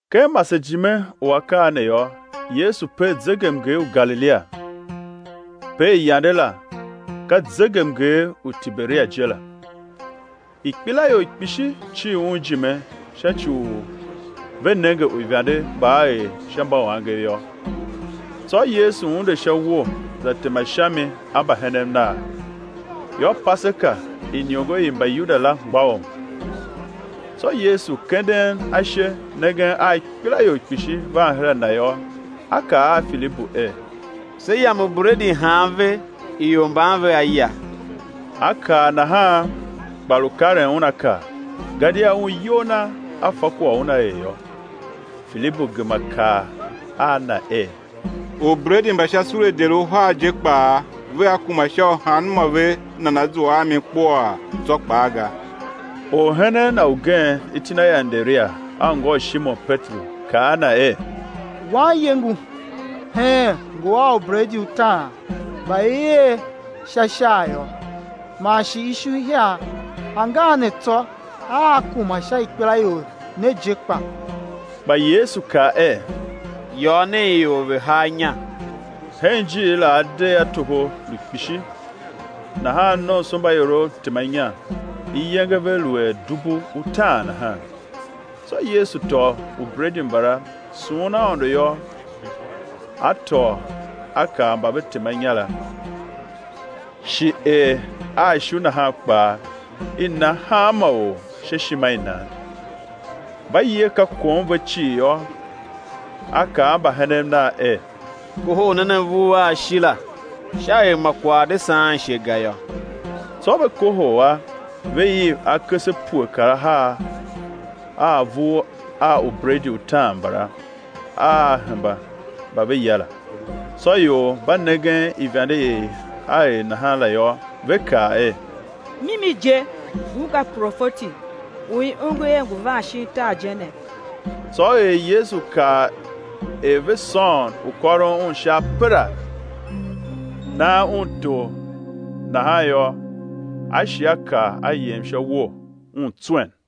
Ken masejime u akaa ne yô, Yesu per zegemnger u Galilia, per yande la, ka zegemnger u Tiberia je la. Ikpelaior kpishi cir Un ijime sha ci u ve nenge uivande mba A er sha mbauangev yô. Tsô Yesu unde sha uwo za tema sha mi a mbahenen Nav. Yô, Paseka, iniongo i Mbayuda la mgbôghom. Tsô Yesu kenden ashe, nengen a ikpelaior kpishi van her a Na yô, A kaa a Filibu er: Sé yam ubredi han ve ior mban vea ya? A kaa nahan, kpa lu karen un a kar, gadia Un iyol Na A fa kwagh u Una er yô. Filibu gema kaa a Na er: Ubredi mba sha sule deri uhar je kpaa vea kuma sha u hanmô ve nana zua a mi kpuaa tsô kpaa ga. Orhenen Na ugen, iti na er Anderia, anngô u Shimon Peteru, kaa a Na er: Wanye ngu heen ngu a ubredi utaan mba i er sha shair yô, man shi ishu ihiar; angan ne tsô, aa kuma sha ikpelaior ne je kpa? Kpa Yesu kaa er: Yôô nen ior ve̱ haa inya. Hen ijiir la adegh a toho lu kpishi. Nahan nomsombaiorov tema inya, iyenge ve lu er dubu utaan nahan. Tsô Yesu tôô ubredi mbala, sughun Aôndo yô, A tôô A kar mba ve tema inya la; shi er a ishu nahan kpaa, i na hanma or sha ishima i nan. Mba ye, ka kom ve cii yô, A kaa a mbahenen Nav er: Kohol nen avur a a shi la, sha er ma kwagh a̱ de saan ishe ga yô. Tsô ve kohol a, ve iv akese pue kar ahar a avur a ubredi utaan mbala, a a hemba mba ve ya la. Tsô ior mba nengen ivande i A er nahan la yô, ve kaa er: Mimi je, ngun ka profeti u i ongo er ngu van shin tar je ne. Tsô er Yesu kav er ve sôôn u kôron Un sha apera, nan Un tor nahan yô, A shi A kar, A yem sha uwo, Un tswen.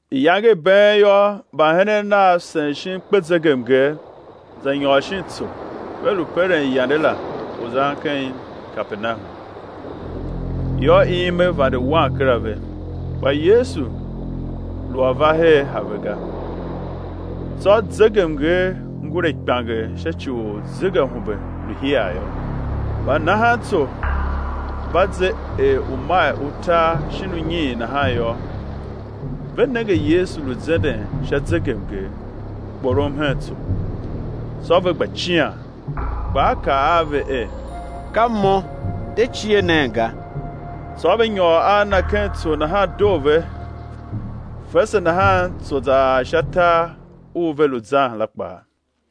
Iyange i been yô, mbahenen Nav sen shin kpezegemnger, za nyôr shin tsô, ve lu peren yande la u zan ken Kapernahum. Yô, ime vande wan kera ve, kpa Yesu lu a va her a ve ga. Tsô zegemnger ngure kpianger sha ci u zegeahumbe lu hiar yô. Mba nahan tso mba ze er umail utar shin unyiin nahan yô, ve nenge Yesu lu zenden sha zegemnger, kporom hen tso; tsô ve gba cian. Kpa A kaa a ve er: Ka Mo, de cie nen ga. Tsô ve nyôr a Na ken tso nahan doo ve; fese nahan tso za ar sha tar u ve lu zan la kpaa.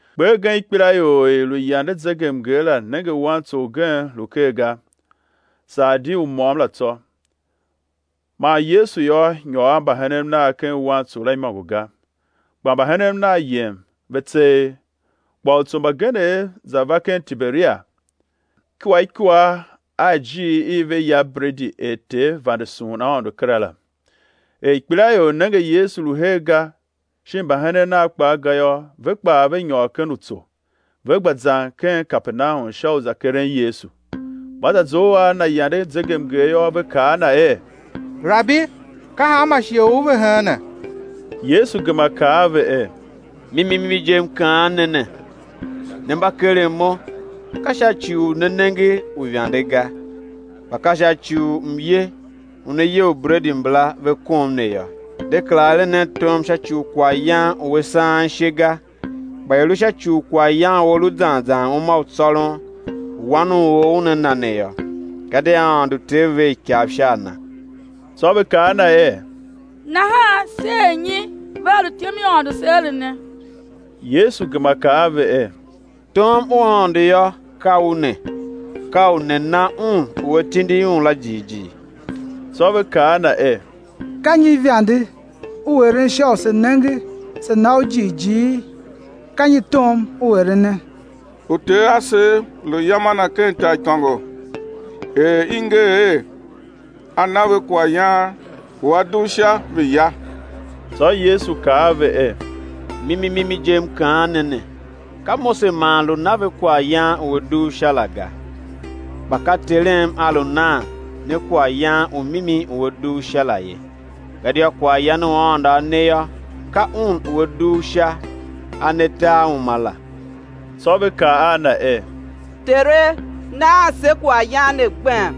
Kper gen ikpelaior i i lu yande zegemnger la, nenge wantso ugen lu ker ga, saa di u môm la tsô, man Yesu yô nyôr a mbahenen Nav ken wantso la imôngo ga, kpa mbahenen Nav yem, ve tseegh. Kpa utso mbagenev za va ken Tiberia ikua ikua a ijiir i ve ya bredi er Ter vande sughun Aôndo kera la. Er ikpelaior nenge Yesu lu her ga, shin mbahenen Nav kpaa ga yô, ve kpaa ve nyôr ken utso, ve gba zan ken Kapernahum sha u za keren Yesu. Mba za zough a Na yande zegemnger yô, ve kaa a Na er: Rabi, ka hanma shighe U ve heene? Yesu gema kaa a ve er: Mimi mimi je, M kaan ne ne, ne mba keren Mo, ka sha ci u ne nenge uivande ga, kpa ka sha ci u mye u ne ye ubredi mbala, ve kom ne yô. De kera eren nen tom sha ci u kwaghyan u a saan ishe ga, kpa i̱ lu sha ci u kwaghyan u a lu zan zan uma u tsôron, u Wan u or Una na ne yô, gadia Aôndo Ter, ver ikav sha a Na. Tsô ve kaa a Na er: Nahan, sé er nyi ve á lu ityom i Aôndo se erene? Yesu gema kaa a ve er: Tom u Aôndo yô, ka u ne: Ka u ne na Un u A tindi Un la jighjigh. Tsô ve kaa a Na er: Ka nyi ivande U eren sha u sé nenge, se̱ na U jighjighi? Ka nyi tom U erene? Uter asev lu ya mana ken taaikôngo; er i nger er: A na ve kwaghyan u a dugh Sha, ve ya. Tsô Yesu kaa a ve er: Mimi, mimi je, M kaan ne ne, ka Mose man lu na ve kwaghyan u a dugh Sha la ga; kpa ka Terem A lu nan ne kwaghyan u mimi u a dugh Sha la ye. Gadia kwaghyan u Aôndo A ne yô, ka Un u A dugh Sha A ne tar uma la. Tsô ve ka a Na er: Tere, naan se kwaghyan ne gbem.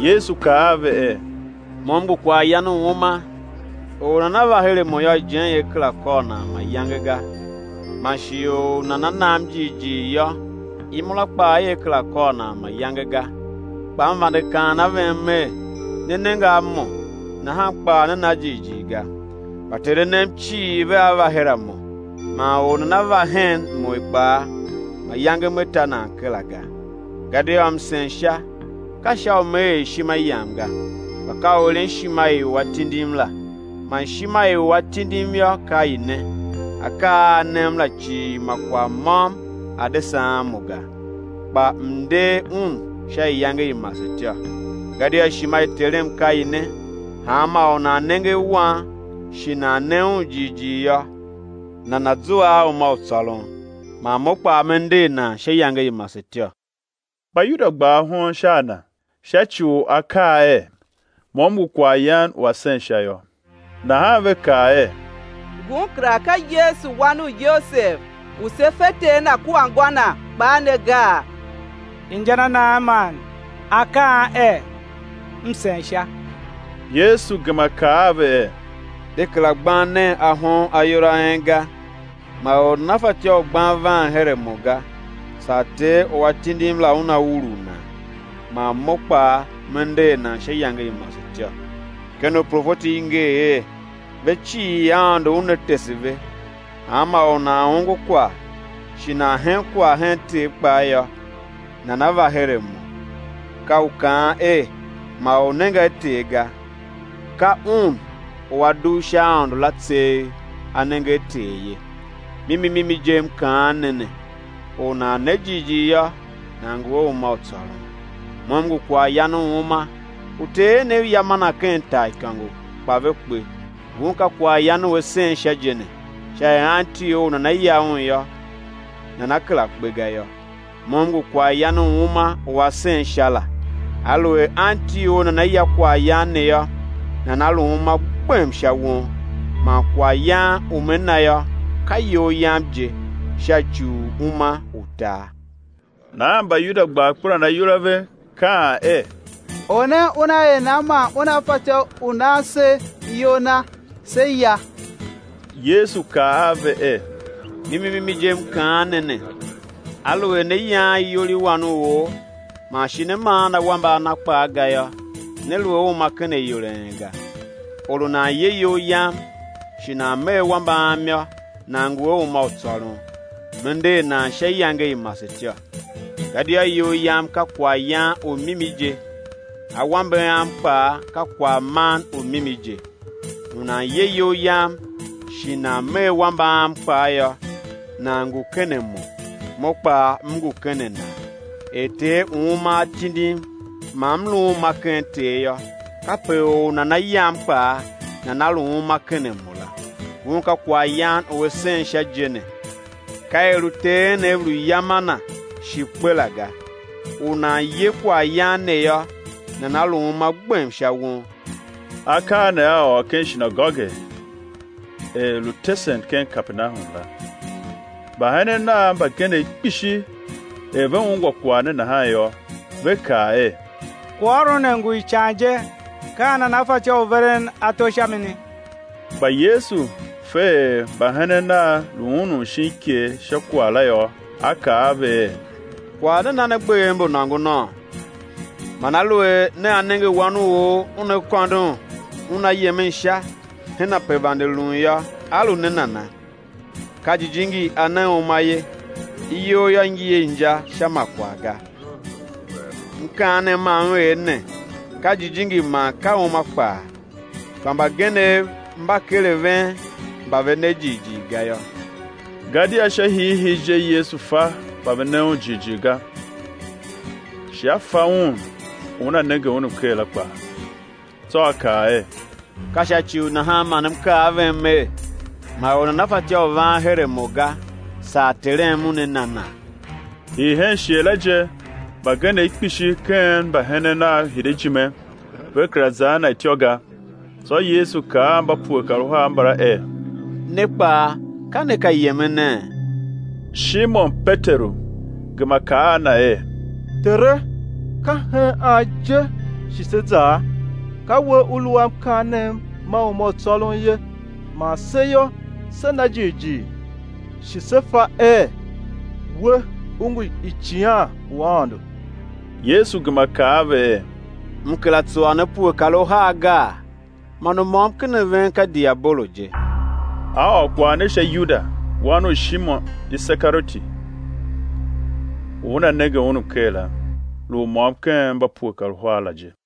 Yesu kaa a ve er: Mo M ngu kwaghyan u uma; or u nana va her a Mo yô, ijen ia kera kôr nan mayange ga; man shi or u nana nam jighjigh yô, imura kpaa ia kera kôr nan mayange ga. Kpa M vande kaan a ven Mer: Ne nenge a Mo, nahan kpaa ne na jighjigh ga. Mba Ter A nem cii, vea va her a Mo; man or u nana va hen Mo kpaa, mayange Me ta nan kera ga. Gadia M sen Sha, ka sha u Me er ishima Yam ga, kpa ka u eren ishima i u A tindim la. Man ishima i u A tindim yô, ka i ne: Akaa a A nem la cii ma kwagh môm a̱ de saan Mo ga, kpa M̱ nder un sha iyange i masetyô. Gadia ishima i Terem ka i ne: Hanma or u nan nenge a Wan, shi nan ne Un jighjigh yô, nana̱ zua a uma u tsôron, man Mo kpaa Me nder nan sha iyange i masetyô. Mbayuda gba ahon sha a Na, sha ci u A kaa er: Mo M ngu kwaghyan u a sen Sha yô. Nahan ve kaa er: Ngun kera ka Yesu Wan u Yosev u se fe ter Na kua ngô Na kpaa ne gaa? Inja na nan man A kaan er: M sen Sha? Yesu gema kaa a ve er: De kera gban nen ahon ayol a en ga. Ma or nana fatyô u gban van her a Mo ga, saa Ter u A tindim la, Una urugh nan; man Mo kpaa Me nder nan sha iyange i masetyô. Ken uprofeti i nger er: Ve cii Aôndo Una tese ve. Hanma or u nan ongo kwagh shi nan hen kwagh hen Ter kpaa yô, nana va her a Mo. Ka u kaan er: Ma or nenge a Ter, ga; ka Un u A dugh sha Aôndo la tseegh A nenge a Ter ye. Mimi mimi je, M kaan ne ne, or u nan ne jighjigh yô, nan ngu a uma u tsôron. Mo M ngu kwaghyan u uma. Uter enev ya mana ken taaikôngo, kpa ve kpe. Ngun ka kwaghyan u a sen Sha je ne, sha er anti or u nana ya un yô, nana kera kpe ga yô. Mo M ngu kwaghyan u uma u a sen sha la; aluer anti or nana ya kwaghyan ne yô, nana lu uma gbem sha won. Man kwaghyan u Me na yô, ka iyol Yam je, sha ci u uma u tar. Nahan Mbayuda gba akperan ayol a ve, kaan er: Or ne Una er nan man Una fatyô u nan se iyol Na, sé ya? Yesu kaa a ve er: Mimi mimi je M kaan ne ne, aluer né yaan iyol i Wan u or, man shi né maan awambe a Na kpaa ga yô, né lu a uma ken ayol a en ga. Or u nan ye iyol Yam, shi nan me awambe Am yô, nan ngu a uma u tsôron; Me nder nan sha iyange i masetyô. Gadia iyol Yam ka kwaghyan u mimi je, awambe Am kpaa ka kwaghman u mimi je. U nan ye iyol Yam shi nan me awambe Am kpaa yô, nan ngu ken a Mo, Mo kpaa M ngu ken a nan. Er Ter u uma A tindim, man M lu uma ken Ter yô, kape or u nana yam kpaa nana lu uma ken a Mo la. Ngun ka kwaghyan u a sen Sha je ne; ka er uter enev lu ya mana, shi kpe la ga. U nan ye kwaghyan ne yô, nana lu uma gbem sha won. Akaa ne A ôr ken shinagoge er lu tesen ken Kapernahum la. Mbahenen Nav mbagenev kpishi er ve ungwa kwagh ne nahan yô, ve kaa er: Kwaghôron ne ngu ican je; ka an nana fatyô, u veren ato sha mini? Kpa Yesu fe er mbahenen Nav lu unun shin iker sha kwagh la yô, A kaa a ve er: Kwagh ne na ne gbev mbu nôngonôô? Man aluer nea nenge Wan u or Una kôndon Una yemen Sha, hen ape vande lun yô, á lu ne nana? Ka Jijingi A ne uma ye; iyol yô, ngi a inja sha ma kwagh ga. Mkaanem ma M er ne, ka jijingi man ka uma kpaa. Kpa mbagenev mba ker a ven mba ve ne jighjigh ga yô. Gadia sha hiihii je Yesu fa mba ve ne Un jighjigh ga, shi A fa un u una nenge Un mker la kpaa. Tsô A kaa er: Ka sha ci u nahan man M kaa a ven Mer: Ma or nana fatyô u van her a mo ga, saa Terem Una na nan. Hii hen shighe la je mbagenev kpishi ken mbahenen Nav hide ijime, ve kera za a Na ityô ga. Tsô Yesu kaa a mba pue kar uhar mbala er: Ne kpaa, ka ne ka yemene? Shimon Peteru gema kaa a Na er: Tere, ka hen an je shi sé zaa? Ka We U lu a mkaanem ma uma u tsôron ye. Man se yô, se na jighjigh shi se fa er We U ngu Icighan u Aôndo. Yesu gema kaa a ve er: M kera tsuwa ne pue kar uhar gaa? Man u môm ken a ven ka diabolo je. A ôr kwagh ne sha Yuda, wan u Shimon Isekarioti u una nenge Un mker la, lu u môm ken mba pue kar uhar la je.